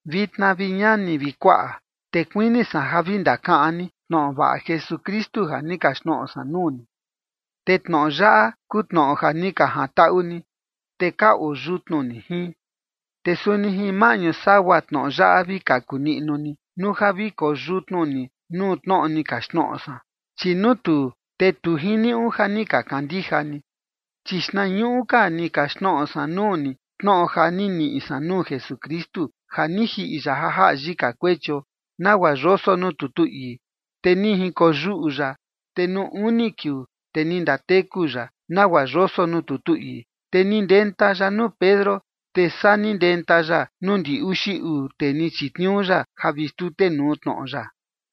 Vitna, vi ñani vi kuaꞌa, te kuini san ja vi ndakaꞌan ni tnoꞌo vaꞌa Jesukristu ja ni kaxtnoꞌo san nuu ni. Te tnoꞌo yaꞌa kuu tnoꞌo ja ni ka jantaꞌu ni, te ka oo yutnu ni jin. Te suni jin maꞌñu sagua tnoꞌo yaꞌa vi kaku niꞌnu ni, nuu ja vi koo yutnu ni nuu tnoꞌo ni kaxtnoꞌo san, chi nuu tuu, te tu jiniuꞌu ja ni ka kandija ni. Chi xtnañuꞌu ka ni kaxtnoꞌo san nuu ni tnoꞌo ja ni niꞌi san nuu Jesukristu: Ja ni jiꞌi ya ja jaꞌa yika kuechio, nagua yoso nuu tutu ii. Te ni jinkoyuꞌu ya, te nuu uni kiuu, te ni ndateku ya, nagua yoso nuu tutu ii. Te ni ndenta ya nuu Pedro, te saa ni ndenta ya nuu ndi uxi uu tee ni chitniuu ya ja vi xtutenuu tnoꞌo ya.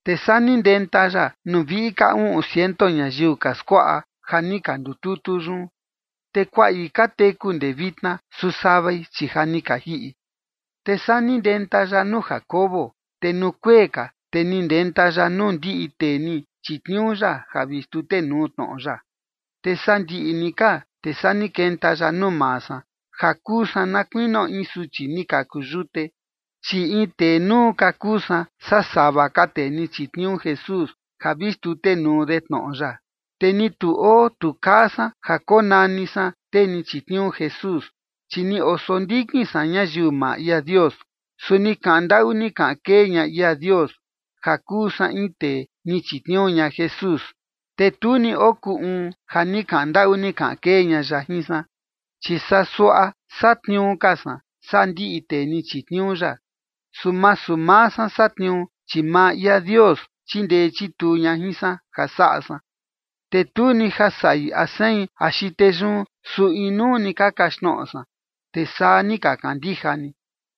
Te saa ni ndenta ya nuu viꞌi ka uꞌun ciento ñayiu ka skuaꞌa ja ni ka ndututu yun, te kuaꞌi ka teku ndee vitna, su savai, chi ja ni ka jiꞌi. Te saa ni ndenta ya nuu Jacobo. Te nuu kuee ka, te ni ndenta ya nuu ndiꞌi tee ni chitniuu ya ja vi xtutenuu tnoꞌo ya. Te sandiꞌi ni ka, te saa ni kenta ya nuu maa san, ja kuu san na kuinio in suchi ni kaku yute. Chi in tee nuu ka kuu san saa sava ka tee ni chitniuu Jesús ja vi xtutenuu de tnoꞌo ya, te ni tu oo tu kaa san ja konani san tee ni chitniuu Jesús, chi ni osondikin san ñayiu maa ia Dios. Su ni kaꞌan ndaꞌu ni kaꞌan kee ña ia Dios, ja kuu san in tee ni chitniuu ña Jesús, te tu ni okuu uun ja ni kaꞌan ndaꞌu ni kaꞌan kee ña ya jin san, chi saa suaꞌa satniuu ka san saa ndiꞌi tee ni chitniuu ya, su masu maa san satniuu, chi maa ia Dios chindee chituu ña jin san ja saꞌa san. Te tu ni ja saꞌi a sein axi tee yun, su inuu ni ka kaxtnoꞌo san, te saa ni ka kandija ni.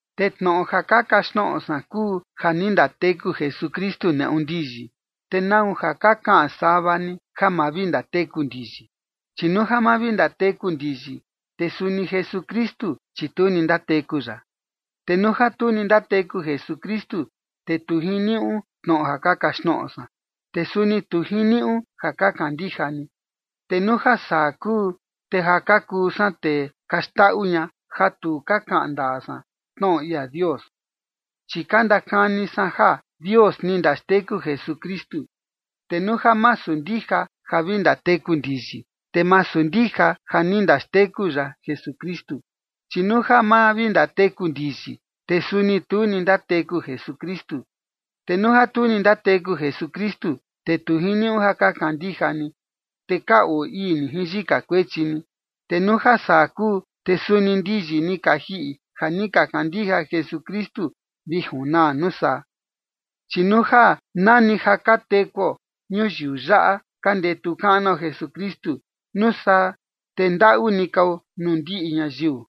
Te tnoꞌo ja ka kaxtnoꞌo san kuu ja ni ndateku Jesukristu neꞌu ndiyi. ¿Te nau ja ka kaꞌan sava ni ja ma vi ndateku ndiyi? Chi nuu ja ma vi ndateku ndiyi, te suni Jesukristu, chi tu ni ndateku ya. Te nuu ja tu ni ndateku Jesukristu, te tu jiniuꞌu tnoꞌo ja ka kaxtnoꞌo san, te suni tu jiniuꞌu ja ka kandija ni. Te nuu ja saa kuu, te ja ka kuu san tee ka xndaꞌu ña, ja tu ka kaꞌan ndaa san tnoꞌo ia Dios, chi ka ndakani san ja Dios ni ndaxteku Jesukristu, te nuu ja masu ndija ja vi ndateku ndiyi, te masu ndija ja ni ndaxteku ya Jesukristu. Chi nuu ja ma vi ndateku ndiyi, te suni tu ni ndateku Jesukristu. Te nuu ja tu ni ndateku Jesukristu, te tu jiniuꞌu ja ka kandija ni, te ka oo ii ni jin yika kuechi ni. Te nuu ja saa kuu, te suni ndiyi ni ka jiꞌi ja ni ka kandija Jesukristu vi junaa nuu saa. Chi nuu ja nani ja ka tekuo ñuyiu yaꞌa ka ndetu kaꞌnuo Jesukristu, nuu saa te ndaꞌu ni kao nuu ndiꞌi ñayiu.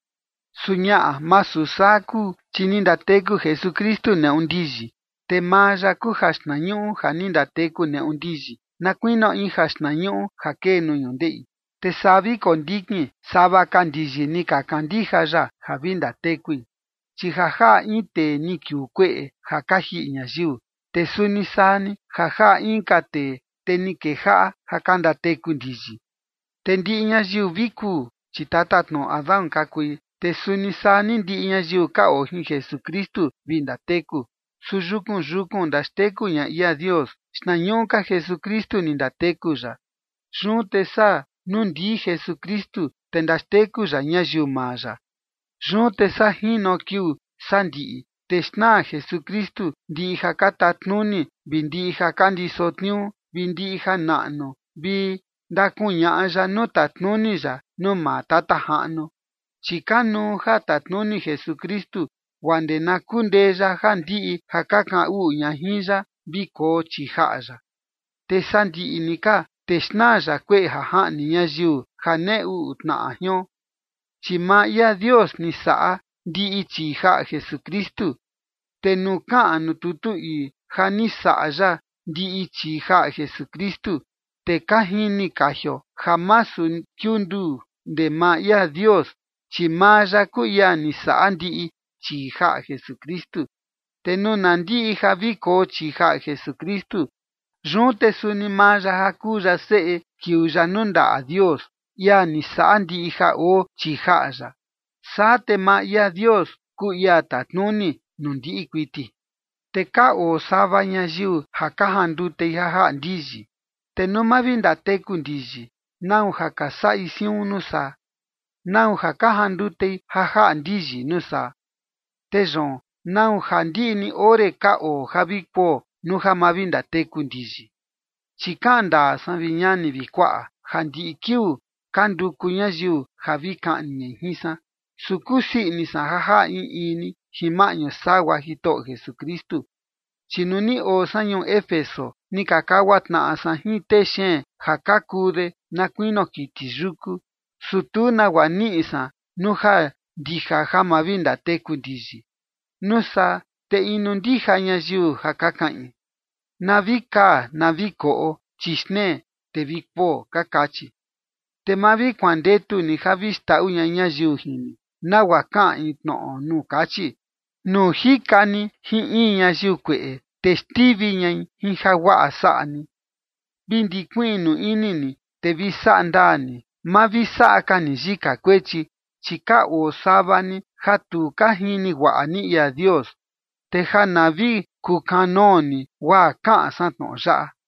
Su ñaꞌa, masu saa kuu, chi ni ndateku Jesukristu neꞌu ndiyi. Te maa ya kuu jaxtnañuꞌu ja ni ndateku neꞌu ndiyi, na kuinio in jaxtnañuꞌu ja kee nuu ñundeꞌi. Te saa vi kondikin sava ka ndiyi ni ka kandija ya ja vi ndatekui. Chi ja jaꞌa in tee ni kiuu kueꞌe ja ka jiꞌi ñayiu, te suni saa ni ja jaꞌa inka tee, te ni kejaꞌa ja ka ndateku ndiyi. Te ndiꞌi ñayiu vi kuu, chi tatatnoꞌo Adán ka kui, te suni saa ni ndiꞌi ñayiu ka oo jin Jesukristu vi ndateku. Su yukun yukun ndaxteku ña ia Dios: Xtnañuꞌu ka Jesukristu ni ndateku ya, yun te saa nuu ndii Jesukristu, te ndaxteku ya ñayiu maa ya. Yun te saa jino kiuu sandiꞌi, te xnaa Jesukristu ndiꞌi ja ka tatnuni vi ndiꞌi ja ka ndiso tniuu vi ndiꞌi janaꞌnu, te ndakuñaꞌa ya nuu tatnuni ya nuu maa Tata Jaꞌnu. Chi kanuu ja tatnuni Jesukristu guaa ndee na kundee ya ja ndiꞌi ja ka kaꞌan uꞌu ña jin ya vi koo chii jaꞌa ya. Te sandiꞌi ni ka, te xnaa ya kueꞌe ja jaꞌni ñayiu, ja nee uꞌu tnaꞌa jion. Chi maa ia Dios ni saꞌa ndiꞌi chii jaꞌa Jesukristu. Te nuu kaꞌan nuu tutu ii ja ni saꞌa ya ndiꞌi chii jaꞌa Jesukristu, te ka jini kajio ja masu kiunduu ndee maa ia Dios, chi maa ya kuu ia ni saꞌa ndiꞌi chii jaꞌa Jesukristu. Te nuu na ndiꞌi ja vi koo chii jaꞌa Jesukristu, yun te suni maa ya ja kuu ya Seꞌe kiuu ya nuu ndaꞌa Dios, ia ni saꞌa ndiꞌi ja oo chii jaꞌa ya. Saa te maa ia Dios kuu ia tatnuni nuu ndiꞌi kuiti. Te ka oo sava ñayiu ja ka jandutei ja jaꞌa ndiyi. Te nuu ma vi ndateku ndiyi, ¿nau ja ka saꞌi siun nuu saa? ¿Nau ja ka jandutei ja jaꞌa ndiyi nuu saa? Te yoon, ¿nau ja ndiꞌi ni ore ka oo ja vi kuo nuu ja ma vi ndateku ndiyi? Chi kaꞌan ndaa san, vi ñani vi kuaꞌa, ja ndiꞌi kiuu ka nduku ñayiu ja vi kaꞌni ñai jin san, su kusii ini san ja jaꞌa in in ni jin maꞌñu sagua Jitoꞌo Jesukristu. Chi nuu ni oo san ñuu Éfeso, ni ka kagua tnaꞌa san jin tee xeen ja ka kuu de na kuinio kiti yuku, su tu nagua niꞌi san nuu ja ndija ja ma vi ndateku ndiyi. Nuu saa te inu ndija ñayiu ja ka kaꞌin: “Na vi kaa na vi koꞌo, chi xtnee te vi kuo” ka kachi. Te ma vi kuandetu ni ja vi xndaꞌu ña ñayiu jin ni, nagua kaꞌan in tnoꞌo nuu kachi: “Nuu jika ni jin in ñayiu kueꞌe, te xtivi ñai jin jaguaꞌa saꞌa ni”. Vi ndikuiꞌnu ini ni, te vi saꞌa ndaa ni, ma vi saꞌa ka ni yika kuechi, chi ka oo sava ni ja tu ka jini guaꞌa ni ia Dios, te ja na vi kukanoo ni guaa kaꞌan san tnoꞌo yaꞌa.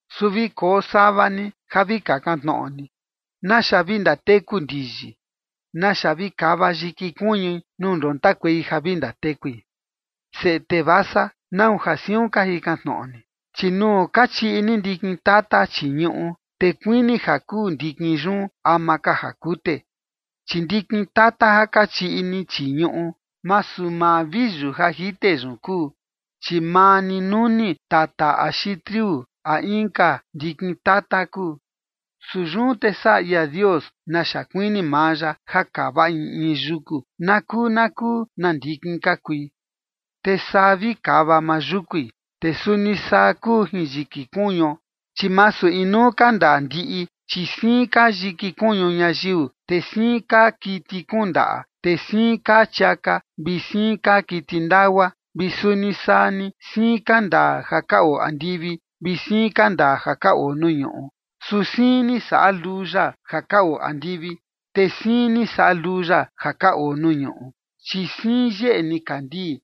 Su vi koo sava ni ja vi kakan tnoꞌo ni: ¿Naxa vi ndateku ndiyi? ¿Naxa vi kava yiki kuñui nuu ndontakuei ja vi ndatekui? Seꞌe tee vasa, ¿nau ja siun ka jikan tnoꞌo ni? Chi nuu ka chiꞌi ni ndikin tata chii ñuꞌu, te kuini ja kuu ndikin yun ama ka ja kute. Chi ndikin tata ja ka chiꞌi ni chii ñuꞌu, masu maa viyu ja jite yun kuu, chi maa ni nuni tata axi triu a inka ndikin tata kuu. Su yun te saꞌa ia Dios naxa kuini maa ya ja kava in in yuku na kuu na kuu na ndikin ka kui, te saa vi kava maa yúkui. Te suni saa kuu jin yiki kuñuo, chi masu inuu ka ndaa ndiꞌi, chi siin kaa yiki kuñu ñayiu, te siin kaa kiti kuun ndaꞌa, te siin kaa chiaka vi siin kaa kiti ndagua. Te suni saa ni siin ka ndaa ja ka oo andivi, te siin ka ndaa ja ka oo nuu ñuꞌu, su siin ni saꞌa luu ya ja ka oo andivi, te siin ni saꞌa luu ya ja ka oo nuu ñuꞌu. Chi siin yeꞌe nikandii,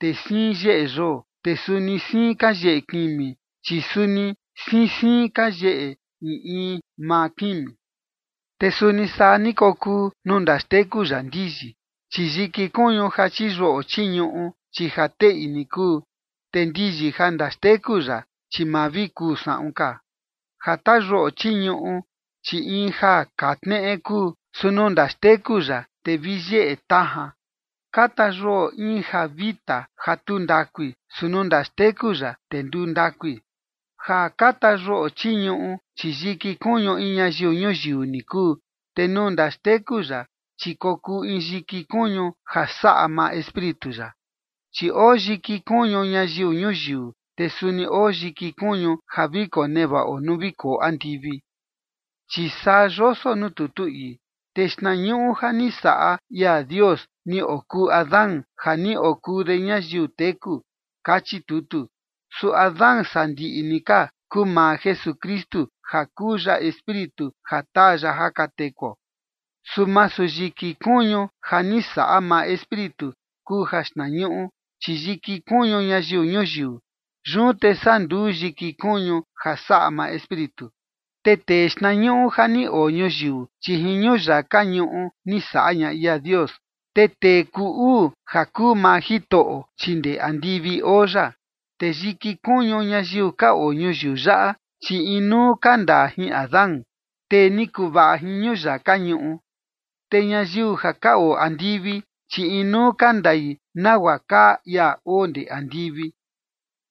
te siin yeꞌe yoo, te suni siin ka yeꞌe kimi, chi suni siin siin ka yeꞌe in in maa kimi. Te suni saa ni kokuu nuu ndaxteku ya ndiyi, chi yiki kuñu ja chiyuꞌo chii ñuꞌu, chi ja teꞌi ni kuu, te ndiyi ja ndaxteku ya, chi ma vi kuu saꞌun ka. Ja tayuꞌo chii ñuꞌu, chi in ja kaa tneꞌe kuu, su nuu ndaxteku ya, te vi yeꞌe tajan. Ka tayuꞌo in ja vita ja tu ndakui, su nuu ndaxteku ya, te nduu ndakui. Ja ka tayuꞌo chii ñuꞌu, chi yiki kuñu in ñayiu ñuyiu ni kuu, te nuu ndaxteku ya, chi kokuu in yiki kuñu ja saꞌa maa Espíritu ya, chi oo yiki kuñu ñayiu ñuyiu, te suni oo yiki kuñu ja vi konevaꞌo nuu vi koo andivi. Chi saa yoso nuu tutu ii: “Tee xtnañuꞌu ja ni saꞌa ia Dios ni okuu Adán ja ni okuu de ñayiu teku”, kachi tutu. Su Adán sandiꞌi ni ka kuu maa Jesukristu ja kuu ya espíritu ja taa ya ja ka tekuo. Su masu yiki kuñu ja ni saꞌa maa Espíritu kuu jaxtnañuꞌu, chi yiki kuñu ñayiu ñuyiu, yun te saa nduu yiki kuñu ja saꞌa maa Espíritu. Te tee xtnañuꞌu ja ni oo ñuyiu, chi jin ñuyaka ñuꞌu ni saꞌa ña ia Dios. Te tee kuu uu ja kuu maa Jitoꞌo, chi ndee andivi oo ya. Te yiki kuñu ñayiu ka oo ñuyiu yaꞌa, chi inuu ka ndaa jin Adán, tee ni kuvaꞌa jin ñuyaka ñuꞌu. Te ñayiu ja ka oo andivi, chi inuu ka ndai nagua kaa ia oo ndee andivi.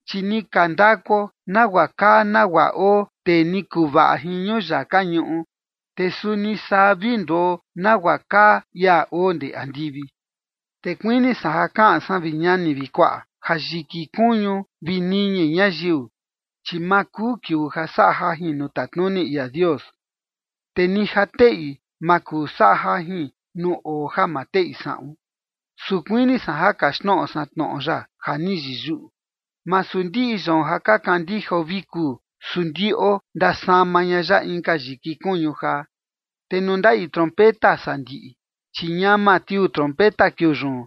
Chi ni ka ndakuo nagua kaa nagua oo tee ni kuvaꞌa jin ñuyaka ñuꞌu, te suni saa vi nduo nagua kaa ia oo ndee andivi. Te kuini san ja kaꞌan san, vi ñani vi kuaꞌa, ja yiki kuñu vi niñi ñayiu, chi ma kuu kiuu ja saꞌa jajin nuu tatnuni ia Dios. Te ni ja teꞌi, ma kuu saꞌa jajin nuu oo ja ma teꞌi saꞌun. Su kuini san ja kaxtnoꞌo san tnoꞌo ya ja ni yiyuꞌu: Masu ndiꞌi yoon ja ka kandijao vi kuu, su ndiꞌo ndasama ña ya inka yiki kuñu jaa. Te nuu ndaꞌi trompeta sandiꞌi, chi ñama tiuu trompeta kiuu yun,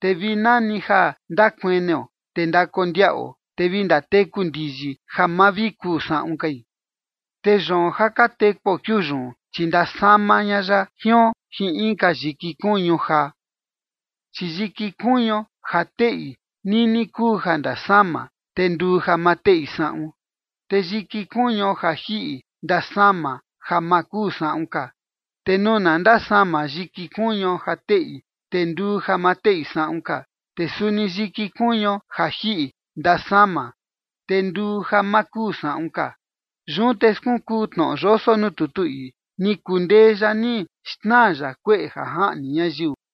te vi nani ja ndakueneo te ndakondiaꞌo, te vi ndateku ndiyi ja ma vi kuu saꞌun kai, te yoon ja ka tekuo kiuu yun, chi ndasama ña ya jion jin inka yiki kuñu jaa. Chi yiki kuñuo ja teꞌi, nini kuu ja ndasama, te nduu ja ma teꞌi saꞌun. Te yiki kuñuo ja jiꞌi ndasama ja ma kuu saꞌun ka. Te nuu na ndasama yiki kuñuo ja teꞌi, te nduu ja ma teꞌi saꞌun ka, te suni yiki kuñuo ja jiꞌi ndasama, te nduu ja ma kuu saꞌun ka. Yun te skunkuu tnoꞌo yoso nuu tutu ii: “Ni kundee ya ni xnaa ya kueꞌe ja jaꞌni ñayiu”.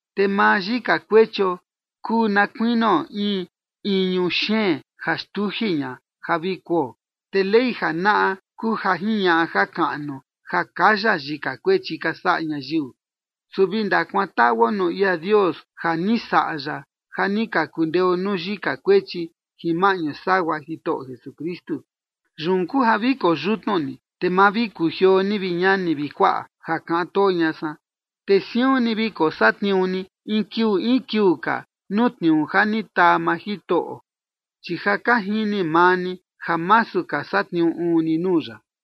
Te maa yika kuechio kuu na kuinio in iñu xeen ja xtuji ña ja vi kuo, te Ley janaꞌa kuu ja jiñaꞌa jakaꞌnu ja kaya yika kuechi ka saꞌa ñayiu. Su vi ndakuantaꞌuo nuu ia Dios ja ni saꞌa ya ja ni ka kundeo nuu yika kuechi jin maꞌñu sagua Jitoꞌo Jesukristu. Yun kuu ja vi koyutnu ni, te ma vi kujioo ni, vi ñani vi kuaꞌa ja kaꞌan too ña san, te siun ni vi kosatniuu ni in kiuu in kiuu ka nuu tniuu ja ni taa maa Jitoꞌo, chi ja ka jini maa ni ja masu ka satniuu uun ni nuu ya.